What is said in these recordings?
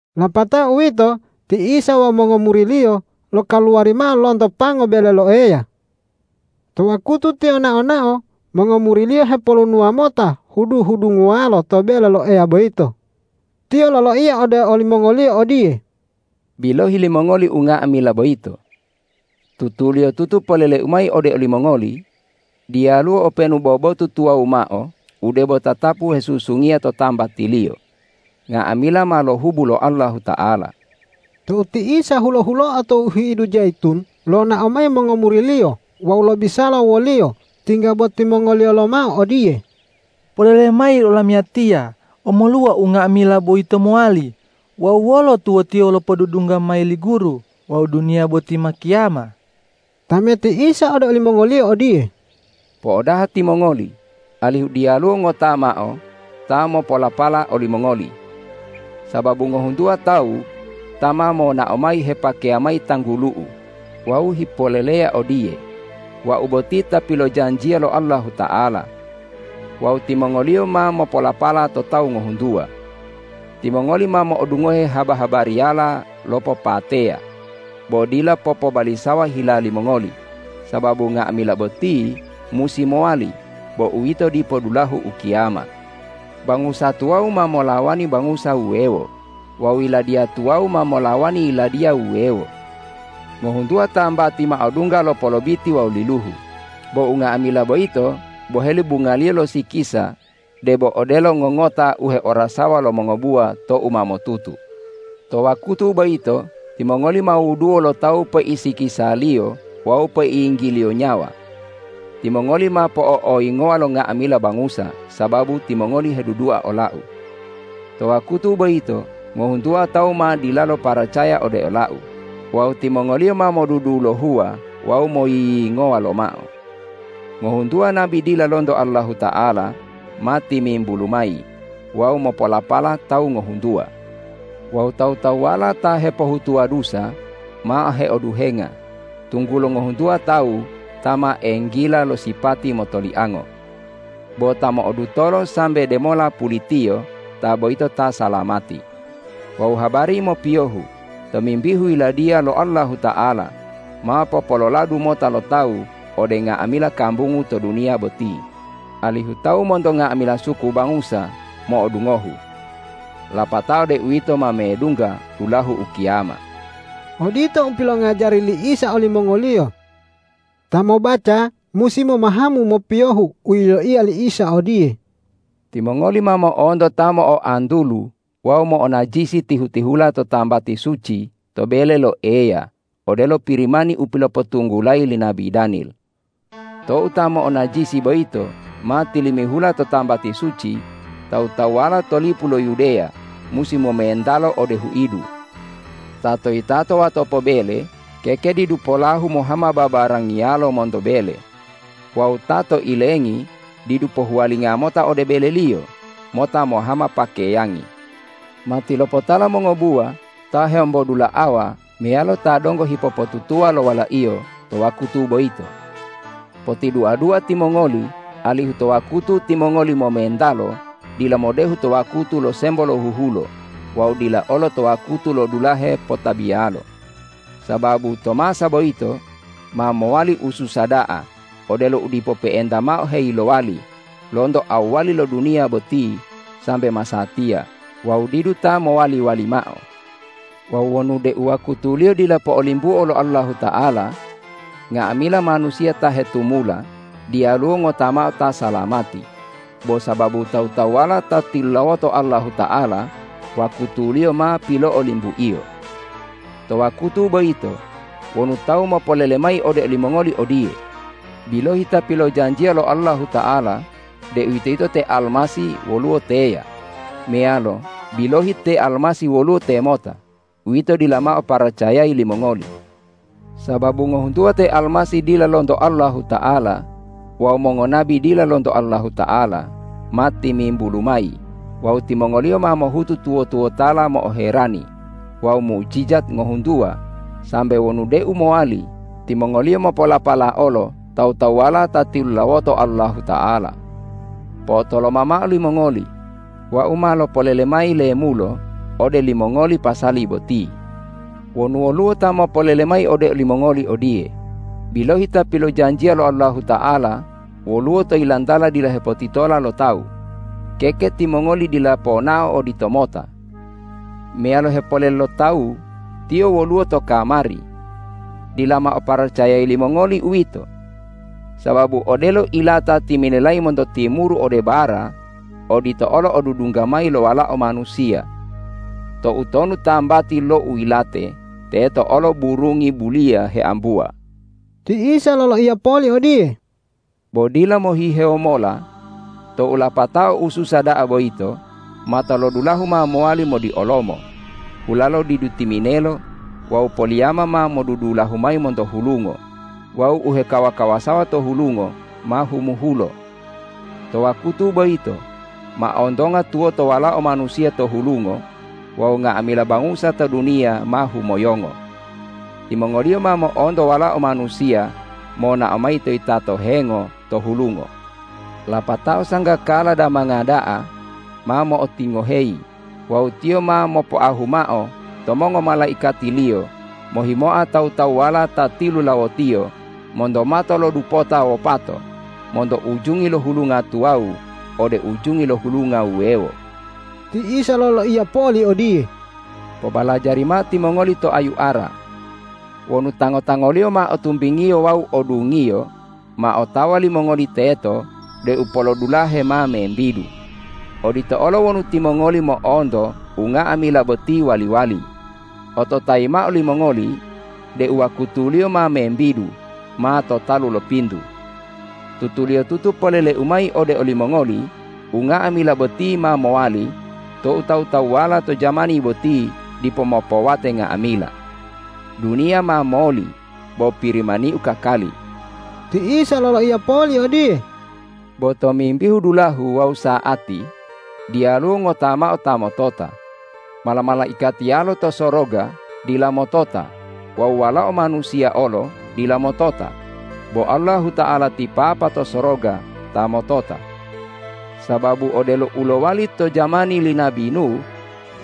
Lapatao uwito ti Isa wawu mongomuri-Liyo lokaluwari mao lonto pango bele lo Eya. To wakutu Tiyo nao-nao mongomuri-Liyo hepolunuwa mota hudu-hudunguwalo to bele lo Eya boyito. Tiyo loloiya ode olimongoliyo odiye,”Bilohi limongoli unga'amila boyito! Tutuliyotutu polele-U mayi ode olimongoli: Diyaluwo openu bo botu tuwawu mao u debo tatapu hesusungiya to tambatiliyo; nga'amila ma lohubu lo Allahuta'ala.” Tou ti Isa hulo-huloa to huidu Jayitun, lonao mayi mongomuri-Liyo wawu lobisala wo-Liyo tingga bo timongoliyo lomao odiye,”Poleleya mayi olamiyatiya, omoluwa unga'amila boyito mowali wawu wolo tuwotiyo lopodudungga mayi li Guru wawu duniya boti ma kiyama?” Tameti Isa ode olimongoliyo odiye,”Po'odaha timongoli, alihu diyaluwo ngota mao ta mopolapala olimongoli! Sababu ngohuntuwa tawu ta ma monao mayi hepakeya mayi tanggulu-U wawu hipoleleya odiye: Wau boti ta pilojanjiya lo Allahuta'ala. Wawu timongoliyo ma mopolapala to tawu ngohuntuwa. Timongoli ma mo'odungohe haba-habariyala lo popateya, bo dila popobalisawa hila limongoli; sababu nga'amila boti musi mowali, bo uwito dipo dulahu ukiyama. Bangusa tuwawu ma molawani bangusa wuwewo wawu yiladiya tuwawu ma molawani yiladiya wuwewo. Ngohuntuwa tambati ma odungga lo polobiti wawu liluhu. Bo unga'amila boyito boheli bungaliyo lo sikisa debo odelo ngongota u heorasawa lo mongobuwa tou ma motutu. To wakutu boyito timongoli ma wuduwo lo tawu peisikisaliyo wawu peiyinggiliyo nyawa. Timongoli ma po'o'oyingowa lo nga'amila bangusa sababu timongoli hedudua ola-U. To wakutu boyito ngohuntuwa tawu ma dilalo paracaya ode ola-U wawu timongoliyo ma modudulohuwa wawu moyiyingowa lomao. Ngohuntuwa nabi dila lonto Allahuta'ala ma timimbulu mayi wawu mopolapala tawu ngohuntuwa. Wawu tawu-tawuwala ta hepohutuwa dusa ma heoduhenga, tunggulo ngohuntuwa tawu ta ma enggila lo sipati motoliango. Bo ta mo'odutolo sambe de mola pulitiyo ta boyito ta salamati. Wawu habari mopiyohu tomimbihu Yiladiya lo Allahuta'ala ma popololadu mota lo tawu ode nga'amila kambungu to duniya boti, alihu tawu monto nga'amila suku bangusa mo'odungohu. Lapatao deuwito ma medungga dulahu ukiyama.” Odito u pilongajari li Isa olimongoliyo. Ta mobaca musi momahamu mopiyohu u yiloiya li Isa odiye,”Timongoli ma mo'onto ta mo'oantulu wawu mo'onajisi tihu-tihula to tambati suci to bele lo Eya odelo Pirimani u pilopotunggulayi li nabi Danil. Tou ta mo'onajisi boyito ma tilimihula to tambati suci, tawu-tawuwala to lipu lo Yudeya musi momentalo ode huidu. Ta to yitato watopo bele keke didu polahu mohama babarangiyalo monto bele. Wawu ta to ilengi didu pohuwalinga mota ode beleliyo mota mohama pakeyangi. Matilopotala mongobuwa ta heombodula'awa meyalo ta donggo hipopotutuwa lo walaiyo to wakutu boyito. Potidua-dua timongoli alihu to wakutu timongoli momentalo dila modehu to wakutu lo sembo lo huhulo wawu dila olo to wakutu lo dulahe potabiyalo. Sababu to masa boyito ma mowali ususa da'a odelo u dipo pe'enta mao heyilowali lonto awwali lo duniya boti sambe masatiya wawu didu ta mowali-wali mao. Wawu wonu deu wakutuliyo dila po'olimbuo lo Allahuta'ala, nga'amila manusiya ta hetumula diyaluwo ngota mao ta salamati; bo sababu tawu-tawuwala ta tilulawoto Allahuta'ala wakutuliyo ma pilo'olimbu-Iyo. To wakutu boyito wonu tawu mopolele mayi ode olimongoli odiye: Bilohi Ta pilojanjiya lo Allahuta'ala deuwitoyito te Almasih woluwo teya! meyalo: Bilohi te Almasih woluwo temota! Uwito dila mao paracayayi limongoli. Sababu ngohuntuwa te almasih dila lonto Allahuta'ala wawu mongonabi dila lonto Allahuta'ala, ma timimbulu mayi wawu timongoliyo ma mohutu tuwo-tuwotala mo'oherani wawu mujijat ngohuntuwa sambe wonu deu mowali timongoliyo mopolapala olo tawu-tawuwala ta tilulawoto Allahuta'ala. Po'otoloma mao limongoli! Wau ma lopolele mayi lemulo ode limongoli pasali boti. Wonu woluwo ta mopolele mayi ode olimongoli odiye: Bilohi Ta pilojanjiya lo Allahuta'ala woluwo to yilantala dila hepotitola lo tawu! keke timongoli dila ponao oditomota. Meyalo hepolele lo tawu: Tiyo woluwo to kamari! Dila mao paracayayi limongoli uwito. Sababu odelo ilata timinelayi monto timuru ode bara, odito olo odudungga mayi lo Walao Manusiya. Toutonu tambati lo u yilate, teto olo burungi buliya heambuwa.” Ti Isa loloiya poli odiye,”Bo dila mohihewo mola tou lapatao ususa da'a boyito, matolodulahu ma mowali modiolomo, hulalo didu timinelo wawu poliyama ma modudulahu mayi monto hulungo wawu u hekawa-kawasawa to hulungo ma humuhulo. To wakutu boyito ma ontonga tuwoto Walao Manusiya to hulungo wawu nga'amila bangusa to duniya ma humoyongo. Timongoliyo ma mo'onto Walao Manusiya monao mayi to yitato hengo to hulungo. Lapatao sanggakala damanga da'a ma mo'otingoheyi wawu Tiyo ma mopoahu mao to mongomalaikati-Liyo mohimoa tawu-tawuwala ta tilulawo-Tiyo monto mato lo dupota wopato, monto ujungi lo hulunga tuwawu ode ujungi lo hulunga wuwewo.” Ti Isa loloiya poli odiye,”Pobalajari mao timongoli to ayu ara. Wonu tango-tangoliyo ma o tumbingiyo wawu o dungiyo, ma otawa limongoli teto deu polodulahe ma membidu. Odito olo wonu timongoli mo'onto unga'amila boti wali-wali, ototayi mao limongoli deu wakutuliyo ma membidu, ma to talu lo pintu. Tutuliyotutu polele-U mayi ode olimongoli: Unga'amila boti ma mowali tou tawu-tawuwala to jamani boti dipo mopowate nga'amila. Duniya ma moli, bo Pirimani-U kakali.” Ti Isa loloiya poli odiye,”Bo tomimbihu dulahu wawu sa'ati diyaluwo ngota mao ta motota, mala-malaikatiyalo to soroga dila motota wawu Walao Manusiya olo dila motota, bo Allahuta'ala ti Papa to soroga ta motota. Sababu odelo u lowali to jamani li nabi Nuh,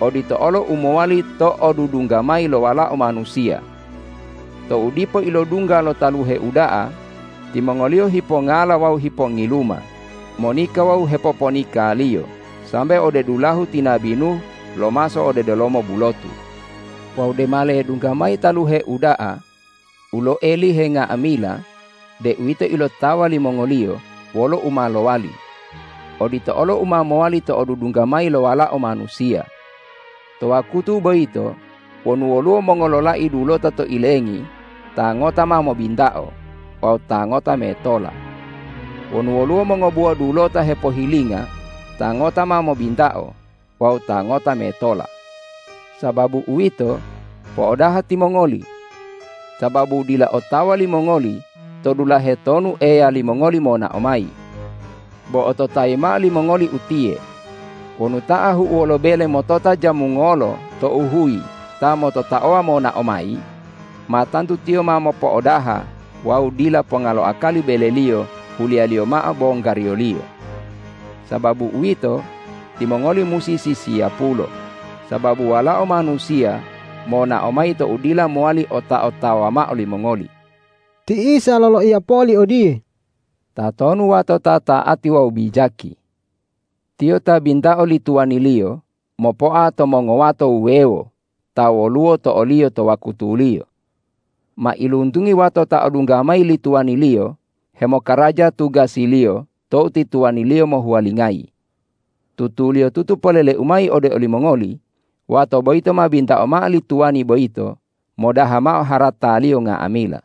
odito olo u mowali to odudungga mayi lo Walao Manusiya. Tou dipo ilodungga lo taluhe uda'a, timongoliyo hipongala wawu hipongiluma, monika wawu hepoponikaliyo sambe ode dulahu ti nabi Nuh lomaso ode delomo bulotu. Wawu dema ledungga mayi taluhe uda'a u loelihe unga'amila deuwito ilotawa limongoliyo wolo u ma lowali. Odito olo u ma mowali to odudungga mayi lo Walao Manusiya. To wakutu boyito wonu woluwo mongololai dulota to ilengi, ta ngota ma mobintao wawu ta ngota metola. Wonu woluwo mongobuwa dulota hepohilinga, ta ngota ma mobintao wawu ta ngota metola. Sababu uwito, po'odaha timongoli! Sababu dila otawa limongoli to dulahe tonu Eya limongoli monao mayi. Bo ototayi mao limongoli utiye: Wonu ta ahu'uwo lo bele motota jamu ngolo tou huyi ta mototaowa monao mayi, ma tantu tiyo ma mopo'odaha wawu dila ponga lo akali beleliyo huliyaliyo mao bonggariyoliyo. Sababu uwito, timongoli musi sisiyapulo, sababu Walao Manusiya monao mayi tou dila mowali ota-otawa mao limongoli.” Ti Isa loloiya poli odiye,”Tatonu wato ta ta'ati wawu bijaki? Tiyo ta bintao li tuwaniliyo mopoa to mongowato wuwewo ta woluwo to oliyo to wakutuliyo. Mailuntungi wato ta odungga mayi li tuwaniliyo hemokaraja tugasiliyo tou ti tuwaniliyo mohuwalingayi. Tutuliyotutu polele-U mayi ode olimongoli: Wato boyito ma bintao mao li tuwani boyito modaha mao harataliyo nga'amila.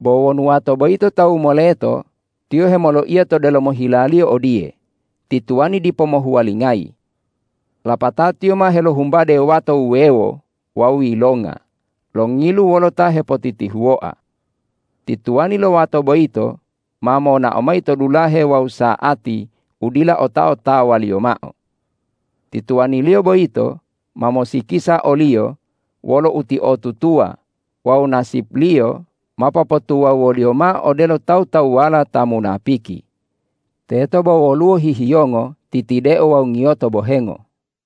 Bo wonu wato boyito tawu moleto, tiyo hemoloiya to delomo hilaliyo odiye, ’Ti tuwaniu dipo mohuwalingayi.’ Lapatao tiyo ma helohumbade wato wuwewo wawu yilonga, longilu wolo ta hepotitihuwoa. Ti tuwani lo wato boyito ma monao mayi to dulahe wawu sa'ati u dila ota-otawaliyo mao. Ti tuwaniliyo boyito ma mosikisa oliyo wolo utiotutuwa wawu nasipliyo ma popotuwawuwoliyo mao odelo tawu-tawuwala ta munapiki. Teto bo woluwo hihiyongo, titideo wawu ngiyoto bohengo.”